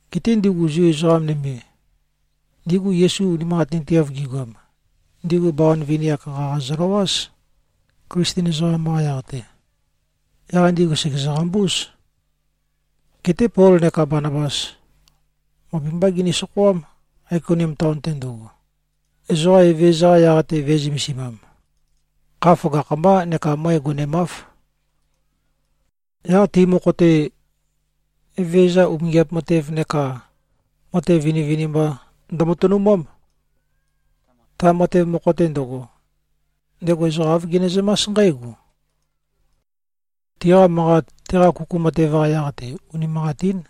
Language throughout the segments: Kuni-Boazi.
Geté ndigu Zu ezoqa nøme, ndigu Yesu unimanqatinteav gigoam, ndigu bawan vini-ak qaqa zøløwáz, Klisten ezoqam-qa yaq-te. Yaq ndigu sègezø-qambúz. Geté Pol neka Banabas møp-mbá gini-sokhoám, Aikonium taon-te ndøgo, ezoqa Evezøza-qa yaq-te vø̄e-zømesimam. Kha føgakh-mbá neka møe gonemáv. Yaq ti mokho-te, Evezøza umingiap matev neka matev vinivinimba ndømatønumám. Ta matev mokho-te ndøgo, ndego ezoqa āv genezømás nqǽgo: Tiqa manqat, teqa kuku matev-qa yaq-te, unimanqatín.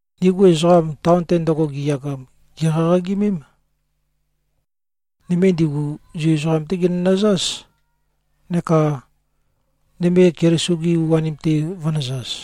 Ndigu ezoqam, taon-te ndøgo giyagam, gèqaqagimém. Nøme ndigu Zu ezoqam-té ginønøzáz, neka nøme Keliso-gi u-anim-te vø̄nøzaz.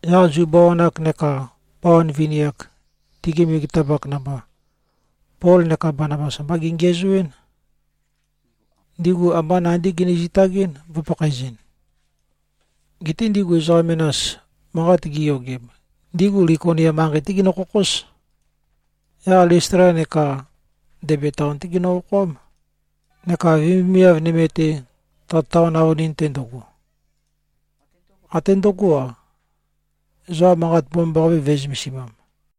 Yaq Zu bawan-ak neka bawan vini-ak, tigi megetapak namba, Pol neka Banabas ambá gengiæzoɨ́n. Ndigu ambá nandí gini-zitagɨ́n, vø̄pakhaezɨn. Geté ndigu ezoqa menas manqat gi꞉yogem, ndigu Likonia manqei-té ginø-khokhóz. Yaq Listla neka Debe taon-té ginø-okhoám, neka vemivemiav nøme-te, ta taon avønin-te ndøgo. Até ndǿgo-a, ezoqa Manqat Mbomambaqape vø̄e-zømesimam.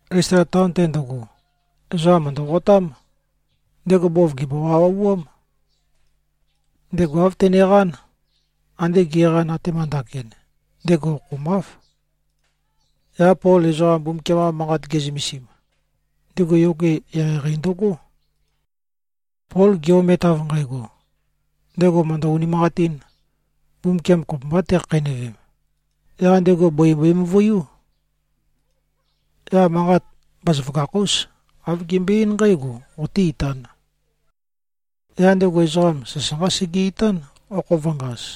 Listla taon-te ndøgo, ezoqam mø̀ndøqotám. Ndego bov gèmbo-wauwauám. Ndego āv teneqán. Ande ge꞉qan, atema ndakin, ndego okhomáv. Yaq Pol ezoqa Mbumbukiam-qa Manqat ge꞉zømesim, ndego yoge eqeieqei ndøgó. Pol ge-omet, av nqægo, ndego mø̀ndø-unimanqatīn, Mbumbukiam kopømbā tekhakheinøvem, yaq ndego bøi mbøe-møvuiú. Yaq manqat bazaføgakh-ús, āv gembøe-eín nqǽgo, “Qoté-itān!” Yaq ndego ezoqam sasanqá sege-itán, okho vø̄ngaz.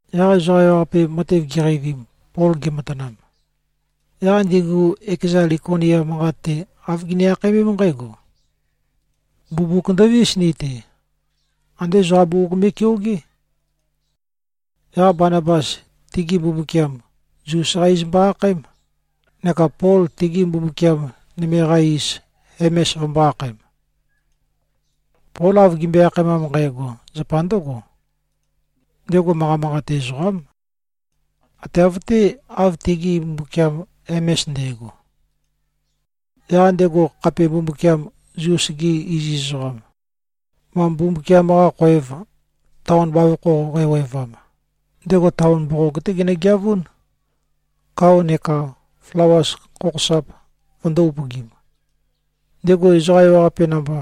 Yaq ezoqa ewaqape matev giqeivim, Pol gematanam, yaq ndigu ekeza Likonia manqat-te, āv gini-akhaemém nqǽgo, “Mbumbuk ndovís ni-te! Andé ezoqa bugug me꞉keogé.” Yaq Banabas tigi mbumbukiam Zus-qá iz mbo-akhaém, neka Pol tigi mbumbukiam nøme-qa iz Hemes vømbō-akhaem. Pol av gimbøe-akhaemam nqægo, zapa ndǿgo: Ndego manqa manqate ezoqám. ⌞Ate av-té, av tigi mbumbukiam Hemes nde꞉go.⌟ Yaq ndego khape mbumbukiam Zus-ge iziz ezoqam, ma mbumbukiam-qa khoev taon bavokho qæwevam, ndego taon mboqog-té genøgeavún, kao neka flawas khokhosap vøndō-upøgim. Ndego ezoqa ewaqape namba,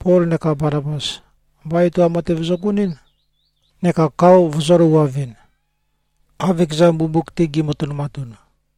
Pol neka Banabas, ambá etoam matev zøgonɨ́n neka kao vøzø̄løuwavɨn, ⌞av ekeza mbumbuk-te gi꞉matønumatun.⌟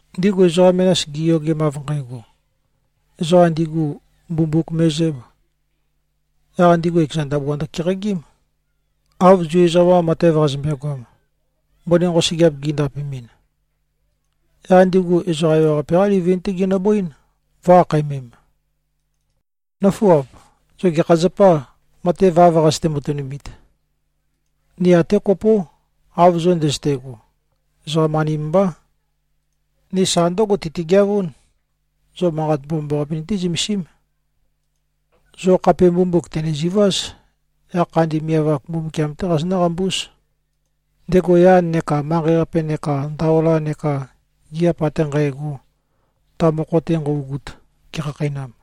Ndigu ezoqa menas giyogem, ⌞av nqægo, ezoqa ndigu mbumbuk me꞉zǣb,⌟ yaq ndigu ekeza ndabua ndøkeqagím, ⌞av Zu ezoqam-qa matev qazømbe-goam, mbøni nqosøgeap gindapemɨn.⌟ Yaq ndigu ezoqa ewaqape-qá livin-té ginøbøín, vø̄-akhaemem, “Nǿfuap. Zo gekha zapâ, matev av nqazøte-matønumit? Ni até kopó, av zo ndøzøte꞉go. Ezoqam-anim mbá. Ni sa ndǿgo tøtigeavún. Zo Manqat Mbomambaqape nití-zømesím. Zo khape mbumbuk tø̀neziváz. Yaq khandi miav-ak Mbumbukiam-té qazonǿ-qambúz, ndego yan neka manqei-qape neka ndaola neka gigiap ate nqægo, ta mokho-te nqøugut, gekhakheinam.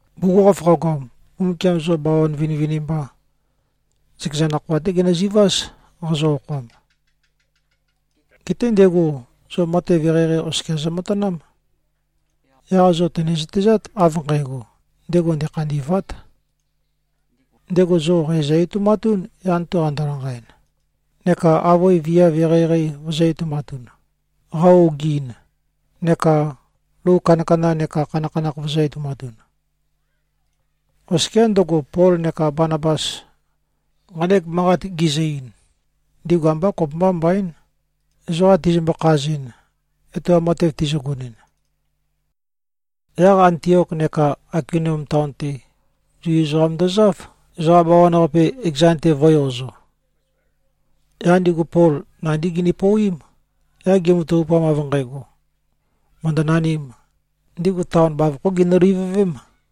Bugukhokhof qagoam, Mbumbukiam zo bawan vinivinimba, zøkeza nakhoa-té genøzuváz, qazo-okhoam. Geté ndego zo matev eqeieqei oskia zømatanám. Yaq zo tø̀ne-zøtezát, av nqægo, ndego ndekhandî꞉vát. Ndego zo qæ zø-etoumatún, yan-te qando-lanqaɨn, neka avøe viav eqeieqei vøzø̄-etoumatun, qa-ogiin, neka lou kandakanda neka khanakhanakh vøzø̄-etoumatun.” Oskiá ndøgo, Pol neka Banabas nqanek manqat gizø-ein, ndigu ambá kopømbá mbaín, ezoqa tizømbø-khazɨn, etoam matev tizøgonɨn. Yaq Antiok neka Aikonium taon-te, Zu ezoqam ndozáv, ezoqa bawan-qape ekezan-te vø̄-eozo. Yaq ndigu Pol nandí gini-pouwím. Yaq gimatavupam, av nqægo, mø̀ndønanīm, ndigu taon bavokhó ginø-livøvém.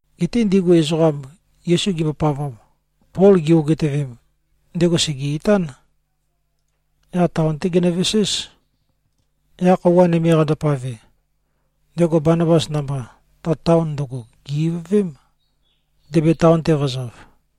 Geté ndigu ezoqam, Yesu gimbopavam, Pol gi-ogitøvem, ndego sège-itán. Yaq taon-té genøveséz. Yaq khøuwa nøme qandopave, ndego Banabas namba, ta taon ndøgo gè-ivøvém, Debe taon-te vø̄zav.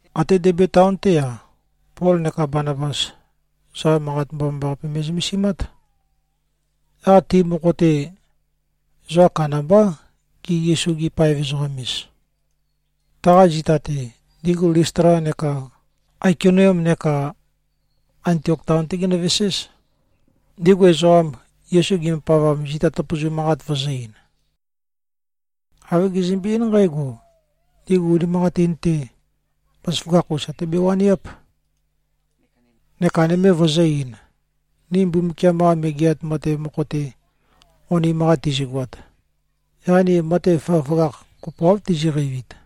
Até Debe taon-té-a, Pol neka Banabas, ezoqa Manqat Mbomambaqape me꞉zømesimát. Yaq ti mokho-te, ezoqa kandambá, gi-Yesu-gi-paev-ezoqam-ez. Taqa zita-te, ndigu Listla neka Aikonium neka Antiok taon-té ginøveséz, ndigu ezoqam, Yesu gimbopavam, zita tøpøzu manqat vøzø-ein. Āv gizømbe-eín nqǽgo: Ndigu unimanqatin-te, bazaføgakh-us até bewaniáp. Neka nøme vøzø̄-ein, “Ni Mbumbukiam-qa Megeat Matev mokho-te onim-qa tizigoat, yaq ni matev føgøføgakh kopoáv tiziqeivit.”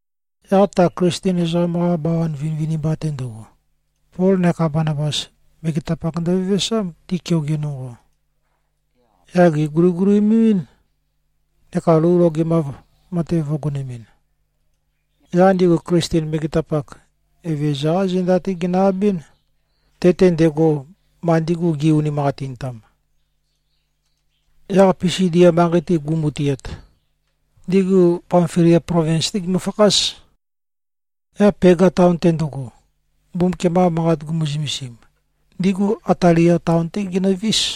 Yaq ta Klisten ezoqam-qa bawan vinivinimba-te ndøgo, Pol neka Banabas, megetapak ndøvevesám, ti keoge nonqo. Yaq gèguligulimemɨ́n, neka lou logemav matev vø̄gonemɨn. Yaq ndigu Klisten megetapak, Evezøza-qá zenda-té ginø-abɨ́n, te-te ndego, ma ndigu gi꞉-unimanqatintam. Yaq Pisidia manqei-te gu꞉mutiat, ndigu Pamfilia plovins-té gimøfakház. Yaq Pega taon-te ndøgo, Mbumbukiam-qa Manqat gumu-zømesim, ndigu Atalia taon-té ginøvís.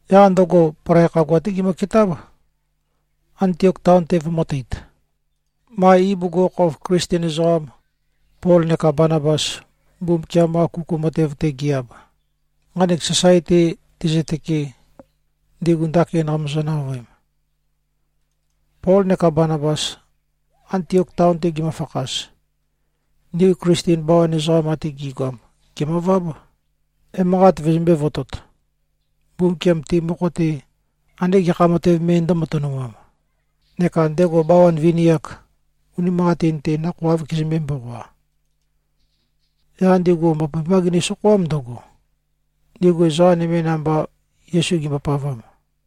Yaq ndøgo, palai khagua-té gimøketáb, Antiok taon-te vømø̄teit, ma ibugukhokhof Klisten ezoqam, Pol neka Banabas, Mbumbukiam-qa kuku matev-te gi-ab, nqanek sasae-te tezøtøke, ndigu ndakin qamøzø-navøem. Pol neka Banabas, Antiok taon-te gimøfakhaz, ndigu Klisten bawan ezoqam ate gi꞉goam, gèmøváb, emanqat vøzømbē-votot, Mbumbukiam ti mokho-te ande gekha matev me ndø̄matønumam, neka ndego bawan vini-ak, unimanqatin-te, nakhoa āv kezømbē-mboqoa. Yaq ndigu møp-mbá gini-sokhoám, ndøgo, ndigu ezoqa nøme namba, Yesu gimbopavam.